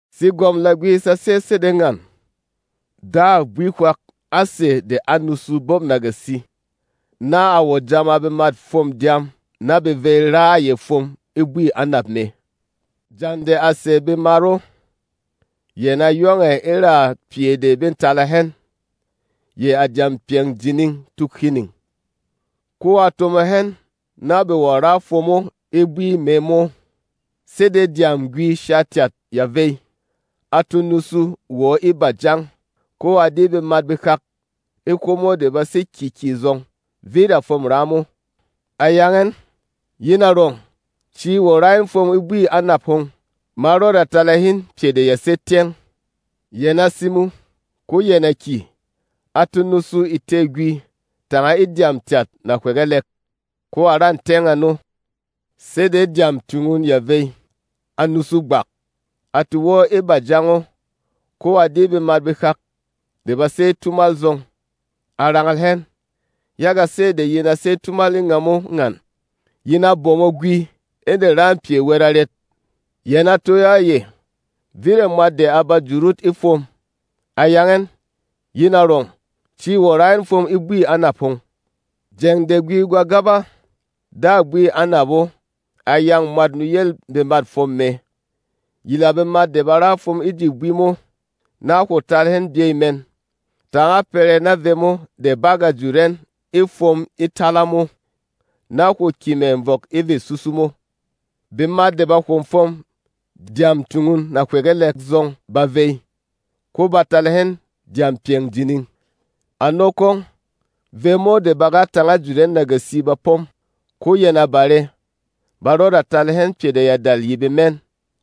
“Segwɔm Lagwi sa sé sede ngan: Dâ bwi hwak á sɛ̀ de á nusu bop nagasi, na a wɔ̀ jāma bemât fwôm dyām na be vey ra a yɛ fwom e bwî anap mɛ. Jeng de a sɛ̀ bemat o, yɛn a yong ɛ̀ e ra pyɛ de bê tala hɛn, yɛ̀ à dyam pyɛng jining tuk hining, ko a tomo hɛn na be wɔ̀ ra fwom o e bwi mɛ mo. Sede dyâm-gwi shatyat ya vey, a to nusu wɔ e bajang, ko a di bemat behak e hwomo de ba sé kyě kyè zɔng, vit a fwôm ra mo. A yang ɛn, ‘Yin arɔng, ci wɔ̀ ra in fwom e bwî anap hom; ma rɔda tala hin pyɛ de ya sé tyɛng.’ Yɛn a simo, ko yɛn a kyè. A to nusu e tê-gwi tanga e dyām tyat nahywegelek, ko a ra tyɛng ano. Sede dyām tyungun ya vey, a nusu gbak, a to wɔ́ e bajang o ko a di bemat behak de ba sé tumal zɔng. A rangal hɛn, ‘Yaga sɛ́ de yin a sé tumal e ngamo ngan, yin a bomo gwi e de râ pyɛ wɛt arɛt?’ Yɛn a toyo a yɛ, ‘Vit a mwat de a ba jut ot e fwom.’ A yang ɛn, ‘Yin arɔng, ci wɔ̀ ra in fwom e bwî anap hom.’ “Jeng de gwi gwa gaba, dâ bwî anap o a yâng mwât nuyêl bemât fwom mɛ, ‘Yila bemat de ba ra fwom e ji bwi mo, na hwo tala hɛn byɛ mɛn. Tānga pɛrɛ na vemo de bá gà jut ɛn e fwom e tala mo, na hwo kyè mɛ̀ vɔk e vê susu mo.’ Bemat de ba hwo fwom dyām tyungun nahywegelek zɔng ba vey, ko ba tala hɛn dyam pyɛng jining. Ano kwong, vemo de bá ga tānga jut ɛn nagasi ba pom, ko yɛn a bare, ba rɔda tala hɛn pyɛ de ya dal ye bemɛn.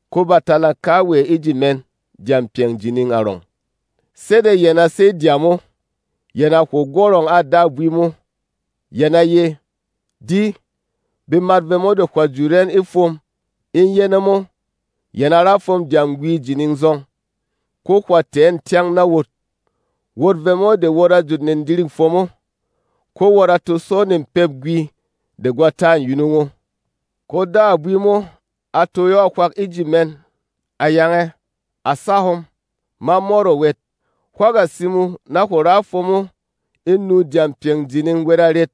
Ko ba talâ kawɛ e ji mɛn dyam pyɛng jining arɔng. Sede yɛn a sey dyām o, yɛn a hwo gwɔrɔng a dâ bwi mo. Yɛn a ye, ‘Di, bemat vemo de hwà jut ɛn e fwom e yɛnɛ mo yɛn a ra fwom dyam-gwi jining zɔng, ko hwà tɛ̀ ɛn tyɛng na wot, wot vemo de wot a jut nedirîk fwom o, ko wot a to sɔ nepêp gwi de gwa ta yunung o!’ “Ko dâ bwi mo a toyo a hwak e ji mɛn, a yang ɛ, ‘À sa hom, ma mɔt o wɛt. Hwá ga simo na hwo ra fwom o e nû dyam pyɛng jining wɛt arɛt?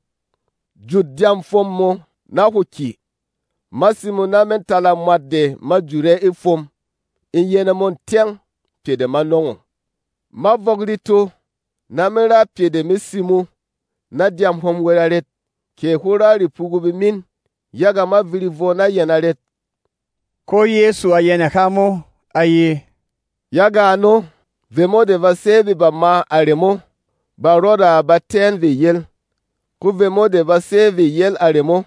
Jut dyam fwom mō, na hwo kyè! Ma simo na me talâ mwat de ma jut ɛ e fwom e yɛnɛ mo tyɛng pyɛ de ma nɔng o. Ma vɔk reto na me ra pyɛ de me simo na dyām hom wɛt arɛt? Kɛ hwó ra repugu bemin, yaga ma viri vwɔ na yɛn arɛt?’” Ko Yɛsu a yɛnɛ há mo, a ye, “Yaga ano, vemo de ba sé vê bama a remo ba rɔda ba tɛ́ ɛn vê yel, ko vemo de ba sé vê yel a remo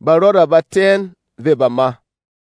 ba rɔda ba tɛ́ ɛn vê bama.”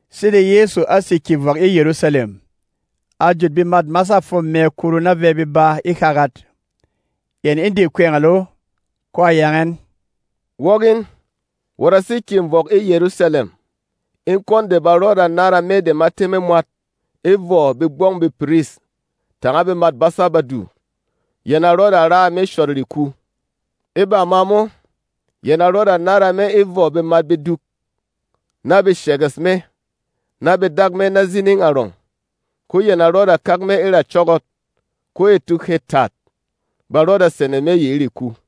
Sede Yɛsu á sè kyè vɔk e Yɛrusalɛm, a jut bemât masâ fwom mɛ kuru na vɛ beba e hagat, yɛn e de kwɛngɛl o, ko a yang ɛn, “Wok in, wot a sé kyè vɔk e Yɛrusalɛm, e kwɔn de ba rɔda nára Me de ma tɛ́ me mwat e vɔ begbɔng bepiris tanga bemât basâ Badu. Yɛn a rɔda ra a me shɔt reku; e bama mo, yɛn a rɔda nára me e vɔ bemat beduk, na be shɛgɛsh me, na be dak me na zining arɔng, ko yɛn a rɔda kak me e ra cɔ́gɔt. Ko e tuk hê tat, ba rɔda sene me yi e reku.”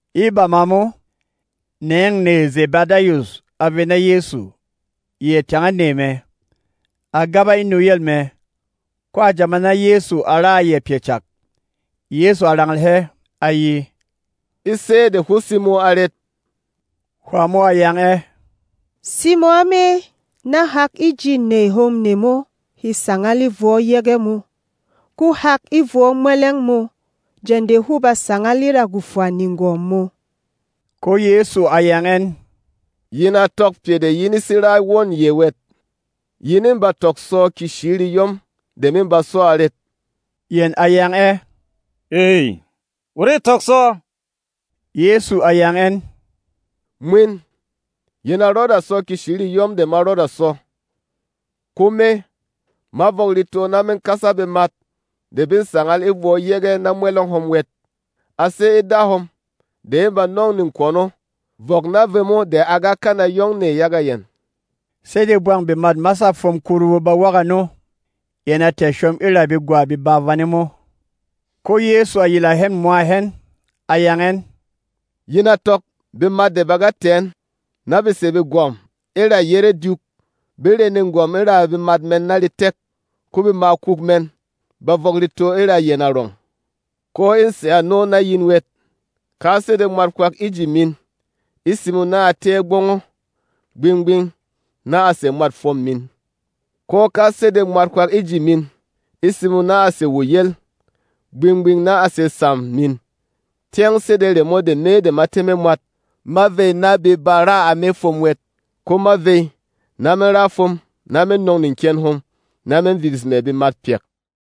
E bama mo, nêng nèy Zɛbɛdayus a vey na Yɛsu, yɛ tanga nèy mɛ. A gaba e nuyel mɛ, ko a jāma na Yɛsu a ra a yɛ pyɛ cak. Yɛsu a rangal hɛ, a ye, “E sɛ́ de hwó simo arɛt?” Hwā mo a yang ɛ, “Simo a me na hak e ji nèy hom nemo he sangal e vwɔ yege mō, ko hak e vwɔ mwɛlɛng mō jeng de hwó ba sangal e ra gwofwa negwɔm mō.” Ko Yɛsu a yang ɛn, “Yin a tɔk pyɛ de yin a sé ra wôn yɛ wɛt. Yin e ba tɔk sɔ keshi reyɔm de me ba sɔ arɛt?” Yɛn a yang ɛ, “Ey, wot ê tɔk sɔ.” Yɛsu a yang ɛn, “Mwin, yin a rɔda sɔ keshi reyɔm de ma rɔda sɔ. Ko me, ma vɔk reto na me kasa bemat de bê sangal e vwɔ yege na mwɛlɛng hom wɛt. A sé e Da hom de e ba nɔng nekwɔn o vɔk na vemo de a ga kana yong nɛ yaga yɛn.” Sede bwang bemât masâ fwom kuru ba wok ano, yɛn a tɛ̀ shom e ra begwa beba vane mo. Ko Yɛsu a yila hɛn mwa hɛn, a yang ɛn, “Yin a tɔk bemat de ba ga tɛ̀ ɛn, na be sè begwɔ̀m e ra yére dyuk be re negwɔm e ra bemat mɛn na retek, ko bemakuk mɛn ba vɔk reto e ra yɛn arɔng. Ko ê sè ano na yin wɛt. Ka sede mwat hwak e ji min e simo na a tɛ́ ɛ gbɔng o, gbing-gbing na a sè mwât fwom min. Ko ka sede mwat hwak e ji min e simo na a sè wo yel, gbing-gbing na a sè sam min, tyɛng sede remo de Me de ma tɛ́ me mwat ma vey na be ba ra a me fwom wɛt. Ko ma vey, na me ra fwom, na me nɔng neken hom, na me vibis mɛ̀ bemat pyak.”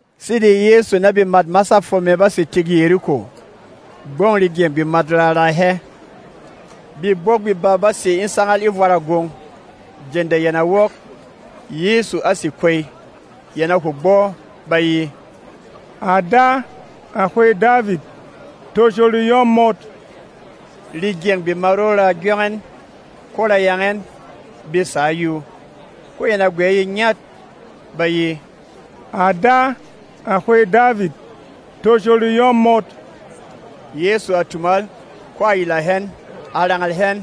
Sede Yɛsu na bemât masâ fwom mɛ bá sè tik Yeriko, gbɔng regyɛng bemat ra raa hɛ. Bebók beba bá sè e sangal e vwarâ gwong. Jeng de yɛn a wok, Yɛsu a sé kwey, yɛn a hwo gbɔ, ba ye, “À Da, à Hwêy Davit, tosho reyɔm mot!” Regyɛng bemat o ra gyong ɛn, ko ra yang ɛn, be sǎ yuu. Ko yɛn a gwɛ̌ ye ngyat, ba ye, “À Da, à Hwêy Davit, tosho reyɔm mot!” Yɛsu a tumal, ko a yila hɛn, a rangal hɛn,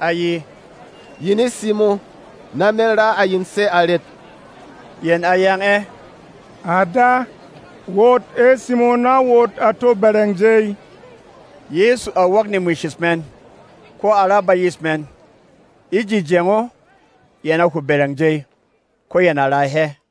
a ye, “Yin e simo na me ra a yin sɛ́ arɛt?” Yɛn a yang ɛ, “À Da, wot e simo na wot a to bɛrɛng jey.” Yɛsu a wok nemwishish mɛn, ko a ra bayis mɛn. E ji jeng o, yɛn a hwo bɛrɛng jey, ko yɛn a raa hɛ.